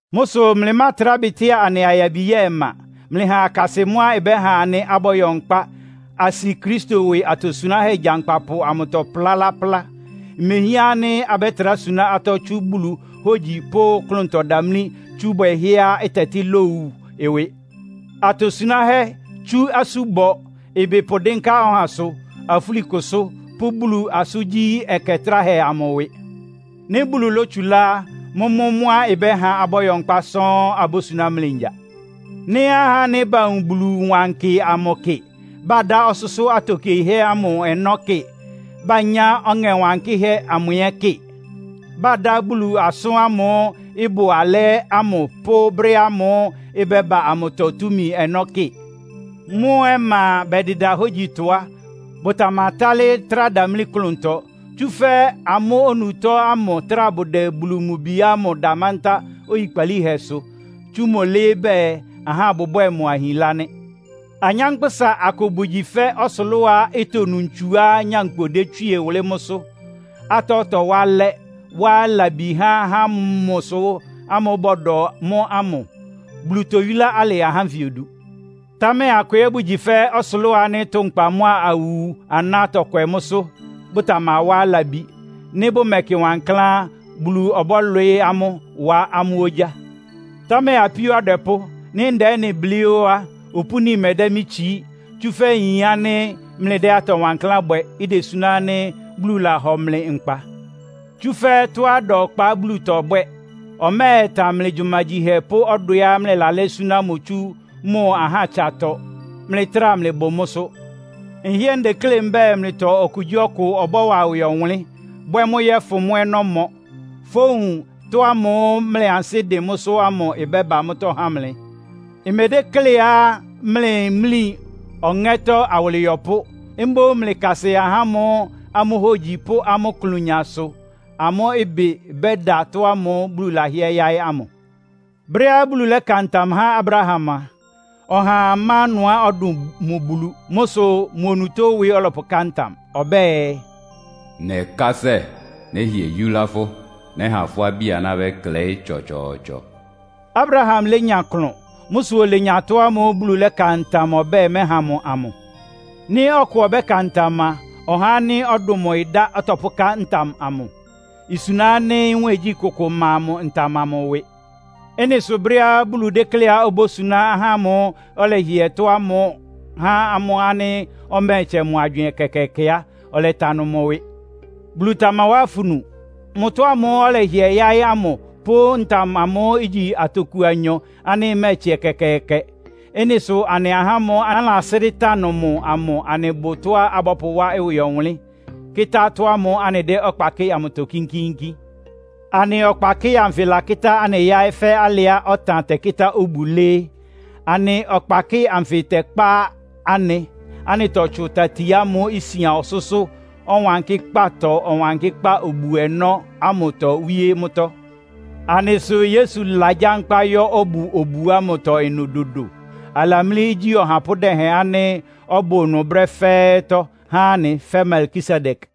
Mʋ́ sʋ mlɩmátrá bɩtɩ́a anɩ ayabi ya ɔma. Mlɩha akasɩ mʋ́á ɩbɛ́ha anɩ abɔ́yɔ nkpá, asi Kristo ɩwɩ atosunáhɛ́ gyankpapʋ amʋtɔ plá laplá. Mehián ánɩ́ abɛ́trá suná atɔ́ tsú Bulu hógyi pʋ́ klʋntɔdamlí tsú bwɛhɛ́á ɩtɛtɩ́ lowu ɩwɩ, atosunáhɛ́ tsú asúbɔ, ɩbɩ pʋdɩ́nká ɔhasʋ, afúlikʋsʋ́ pʋ́ Bulu asʋ́ngyí ɛkɛ tráhɛ amʋ ɩwɩ. Nɩ́ Bulu lótsulá á, mʋ́mʋ́ mʋ́á ɩbɛ́ha abɔ́yɔ nkpá sɔ́ɔ́n abósuná mlɩ ngya. Nɩ́ ahá ánɩ́ bawun Bulu wankɩ amʋ kɩ, badá ɔsʋ́sʋ́ atokiehɛ́ ɔnɔ́ kɩ, banyá Ɔŋɛ Wankɩ́hɛ́ amʋ ɛ́ kɩ, bádá Bulu asʋ́n ámʋ́ʋ́ ɩbʋ alɛ́ ámʋ pʋ́ brɛ́ ámʋ́ʋ́ ɩbɛ́ba amʋtɔ túmi ɔnɔ́ kɩ, mʋ́ ɔma bɛdɩda hógyitɔ á, bʋtamatálɩ́ trá damlí klʋntɔ. Tsúfɛ́ amʋ́ onutó ámʋ trá bʋdɛ Bulu mʋ Bi ámʋ da mántá oyikpalíhɛsʋ, tsú mʋ́ lɩ́ɩ́ bɛɛ, ahá bʋbwɛ́ɛ mʋ ahinlá nɩ́. Anyánkpʋ́sa akʋ bʋgyi fɛ́ ɔsʋlʋ́á itonu ntsuá nyankpʋ détswíe wʋlɩ́ mʋ́sʋ́, atɔ́ tɔwá alɛ́, wá labi há ahá ámʋ sʋ ámʋ́ʋ́ bɔdɔ mʋ́ ámʋ. Bulu toyúlá alɩ ahá ánfɩ odu. Támɛ akʋ ɛ́ bʋgyi fɛ́ ɔsʋlʋ́ʋ ánɩ́ tʋnkpa mʋ́a awu aná tɔkwɛ mʋ́sʋ́, bʋtamawá labi. Nɩ́ bʋmɛkɩ wankláán á, Bulu ɔbɔ́lwɩɩ́ amʋ́, wá amʋ́ ogyá. Támɛ apíó adwɛpʋ́, nɩ́ ndɛ ɩ́nɩ blɩ́ ó á, opúni mɛdɛ́ mɩ́ tsií. Tsúfɛ́ nyin ánɩ́ mlɩdɛ́ atɔ wankláán bwɛ, idesuná ánɩ́ Bulu lahɔ mlɩ nkpa. Tsúfɛ́ tɔ́á ɩda ɔkpa Bulu tɔbwɛ́. Ɔmɛ́ɛtan mlɩ gyumagyihɛ pʋ́ ɔdwɛá mlɩlalɛ́ súná mʋ tsú mʋ ahátsatɔ, mlɩtráa mlɩbʋ mʋ́sʋ́. Nhɩ́ɛ́ ndeklé mbɛ́ɛ, mlɩtɔ okugyíɔkʋ ɔbɔ́wa ɩwɩ ɔwʋnlɩ́n, bwɛ́ mʋ́ yɔ́fʋn mʋ́ ɔnɔ́mɔ, fówun ɩtɔ́ ámʋ́ʋ́ mlɩ ansɩ́ dɩn mʋ́sʋ́ ámʋ ɩbɛ́ba mʋ́tɔ́ há mlɩ. Mmedékléá mlɩ mlí ɔŋɛ́tɔ́ awʋlɩyɔpʋ́. Mboún mlɩkasɩ ahá ámʋ́ʋ́ amʋ́ hógyi pʋ́ amʋ́ ɩklʋnya sʋ amʋ́ ɩbɩ bɛ́da ɩtɔ́ ámʋ́ʋ́ Bulu lɛ́hɩɛ yáɩ́ ámʋ. Brɛ́á Bulu lɛ́ka ntam há Abraham a, ɔhaa má ɩnʋá ɔdʋn mʋ Bulu. Mʋ́ sʋ mʋ onutó ɩwɩ ɔlɔ́pʋká ntam. Ɔbɛ́ɛ, “Nɛkásɛ, nɛ́hɩɛ yúlá fʋ́. Nɛ́ha fʋ́ abí-aná bɛ́klɛɩ́ tsɔtsɔɔtsɔ!” Abraham lénya klʋn. Mʋ́ sʋ olenya ɩtɔ́ ámʋ́ʋ́ Bulu lɛ́ka ntam ɔbɛ́ɛ mɛ́ha mʋ amʋ. Nɩ́ ɔkʋ ɔbɛ́ka ntam a, ɔhá ánɩ́ ɔdʋn mʋ ɩdá ɔtɔpʋ́ká ntam amʋ. Isuna ánɩ́ nwɛ́ɛngyí kʋkʋ má mʋ ntam amʋ ɩwɩ. Ɩ́nɩ sʋ brɛ́á Bulu dékléá obósuná ahá ámʋ́ʋ́ ɔlɛhɩɛ tɔ́ ámʋ há ámʋ ánɩ́ ɔmɛ́ɛtsɛ mʋ agywɩɩn ɛkɛkɛɛkɛ á, ɔlɛtanʋ mʋ ɩwɩ. Bulu tamawá afunu! Mʋ tɔ́ ámʋ́ʋ́ ɔlɛhɩɛ yáɩ́ ámʋ, pʋ́ ntam amʋ igyi atoku anyɔ ánɩ́ ɩmɛ́ɛtsɛ ɛkɛkɛɛkɛ. Ɩ́nɩ sʋ anɩ ahá ámʋ́ʋ́ anɩlasrɩ́ tanʋ mʋ amʋ anɩbʋ tɔ́á abɔ́pʋwá ɩwɩ ɔwʋnlɩ́n, akɩta tɔ́ ámʋ́ʋ́ anɩdɛ́ ɔkpa kɩ́ɩ amʋtɔ kínkíínkín. Anɩ ɔkpakɩ́ɩ anfɩ lakɩ́tá anɩ yáɩ́ fɛ́ alɩá ɔtan tɛkɩ́tá obu lɩ́ɩ́. Anɩ ɔkpakɩ́ɩ anfɩ tɛkpá anɩ, anɩtɔtsʋn tati ámʋ́ʋ́ isian ɔsʋ́sʋ́ Ɔwankɩ́kpátɔ Ɔwankɩ́kpá obu-ɔnɔ́ ámʋtɔ wíé mʋ́tɔ́. Anɩ sʋ Yesu lagyankpá yɔ́ ɔbʋ obu ámʋtɔ ɩnʋ dodo. Alamlí igyí ɔhapʋ́ dɛhɛn ánɩ́ ɔbʋ ɩnʋ brɛ́ fɛ́ɛ́tɔ́ há anɩ fɛ́ Melkisedek.